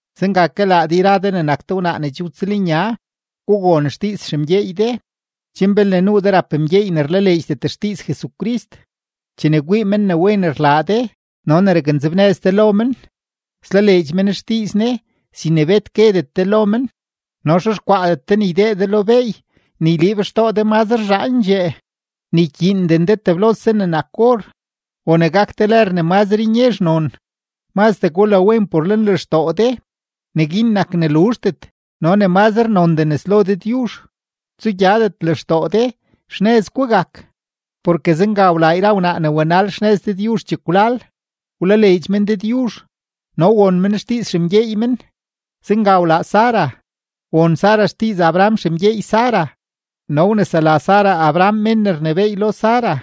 Zenga ke laa de yra de ne nak de wnaa ne che wtsëlnya, gugon xdiiz xemgyeey de, chen belne nuu de rap mgyeey ne rlaleedxdet xdiiz Jesucrist, chene kwii men ne wen rlaa de no ne raknzebnëz de lo men, slaleedx men xdiiz Ne sin ne bet guedet de lo men. No xexkwaadet de ne ydee de lo beey ne yliib xtoo de mazre zhaandxee, ni ykyiinden de teblose ne nak or, o ne gak de lër ne mazre nyezh non; mazdee gulawen por lenlextoo de; neguin nak ne luzhdet no ne mazre nondee nes lo Dëdyuzh. Tsugyadet lextoo de, xnëz gugak. Porke zenga wlaa yra wnaa ne wanal xnëz Dëdyuzh chekwlal; wlaleedx men Dëdyuzh no won men xdiiz xemgyeey men. Zenga wlaa Sara, won Sara xdiiz Abraham xemgyeey Sara no wnesela Sara Abraham mén ne rnebééy lo Sara.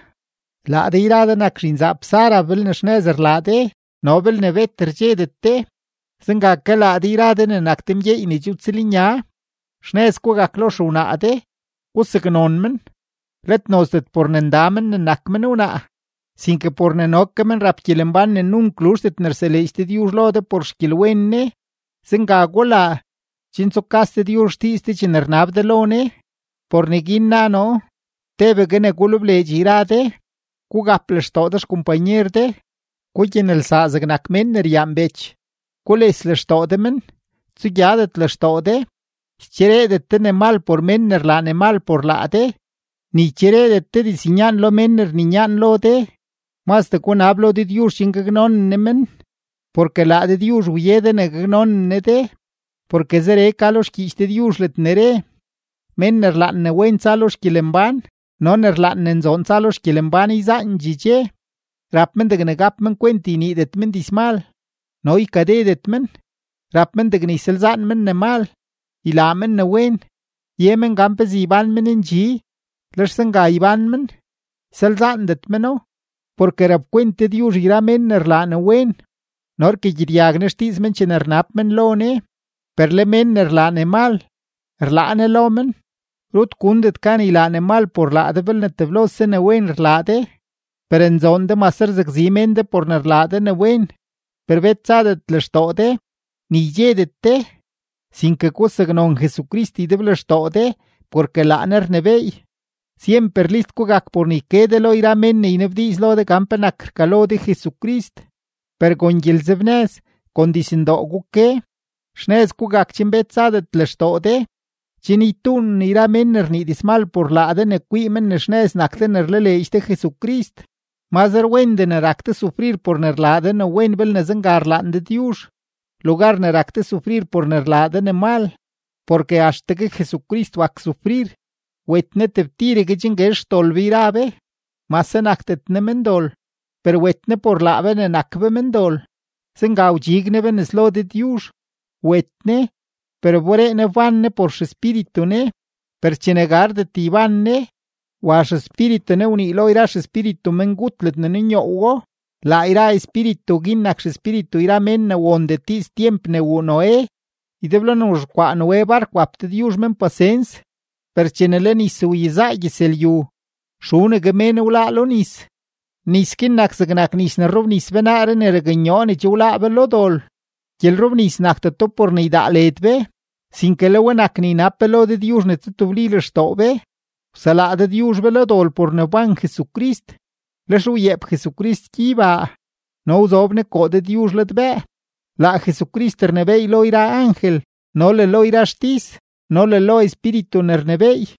Laa de yra de nak zhinzaap Sara belne xnëz rlaa de no belne bet rdxedet de. Zenga ke laa de yra de ne nak de mgyeey ne che wtsëlnya, xnëz gugak lo xewnaa de; gusaknon men, let nozdet por ne nda men ne nak men wnaa, sinke por ne no ke men rap gyelembán ne nunk luzhdet ne rseleedx Dëdyuzh lo de por xgyelwen Ne. Zenga gulaa, chen tsukas Dëdyuzh xdiiz de chene rnab de lo Ne. Por neguin na noo: tebegue ne gulebleedx yra de, gugap lextoo de xkompanyer de, gugyanelsaa zegnak mén ne ryaan bech, gules lextoo de men, tsugyadet lextoo de. Ychereedet de ne mal por mén ne rlaa ne mal por laa de, ni ychereedet de diznyaan lo mén ne rninyaan lo de; mazdee gunab lo Dëdyuzh chen gaknonen Ne men, porke laa Dëdyuzh wye de ne gaknonen Ne de. Porke zeree ka lo xgyiich Dëdyuzh ledne re: Mén ne rlaan ne wen tsa lo xgyelembán no ne rlaan ne nzoon tsa lo xgyelembán yzaandxee dxe, rap men degne gap men kwent yniidet men dizmal no ykadedet men. Rap men degne ysalzaan men ne mal, ylaa men ne wen. Ye men gan pezee ybán men ndxi, lex zenga ybán men, ysalzaandet meno. Porke rapkwent Dëdyuzh yra mén ne rlaa ne wen, no rkagyedyag Ne xdiiz men chene rnab men lo Ne, per le mén ne rlaa ne mal, rlaa Ne lo men. Rut gundet gan ylaa ne mal por laa de belne teblose ne wen rlaa de. Per nzoon de mase rzakzi mén de por ne rlaa de ne wen, per bet tsadet lextoo de, ni ydxedet de, sinke gusaknon Jesucrist ydeblextoo de porke laa Ne rnebééy. Syemper list gugak por ne yke de lo yra mén ne ynabdiiz lo de gan penak rkalo de Jesucrist, per kon gyelenzebnëz, kon dizndoo guke. Xnëz gugak chen bet tsadet lextoo de, chen ytuunen yra mén ne rnii dizmal por laa de ne kwii men ne xnëz nak de ne rlaleedx de Jesucrist. Mazre wendee ne rak de sufrir por ne rlaa de ne wen belne zenga rlaan Dëdyuzh, lugar ne rak de sufrir por ne rlaa de ne mal. Porke axtegue Jesucrist wak sufrir, wet Ne tebtiregue chen guezh xdol be yra be, mase nakdet Ne mendol, per wet Ne por laa be ne nak be mendol; zenga wdxig Ne be nes lo Dëdyuzh. Wet Ne, per wberee Ne wbán Ne por XEspíritu Ne. Per chene gardet yban Ne, wa XEspíritu Ne wnii lo yra xespíritu mengut ledne nunyoowo. Laa yra espíritu guin nak xespíritu yra mén ne wondet diiz tyemp ne wuu Noé; ydeblo ne wzhexkwaa Noé bark wap Dëdyuzh yra mén guin pasens. Per chene le nis wyezaa gyëzlyu, xunegue mén wláá lo nis. Nis guin nak zegnak nis ne rrobnis be naaree ne raknyoo ne che wláá be lo dol. Gyelrobnis nakdeto por ne ydaa led be, sinke le we nak ne ynab be lo Dëdyuzh ne tsutebli lextoo be. Wselaa Dëdyuzh be lo dol por ne wban Jesucrist. Lex wyeep Jesucrist gyeybaa no zob Ne koo Dëdyuzh ladbëë. Laa Jesucrist rnebééy lo yra angel no le lo yra xtis no le lo espíritu ne rnebééy.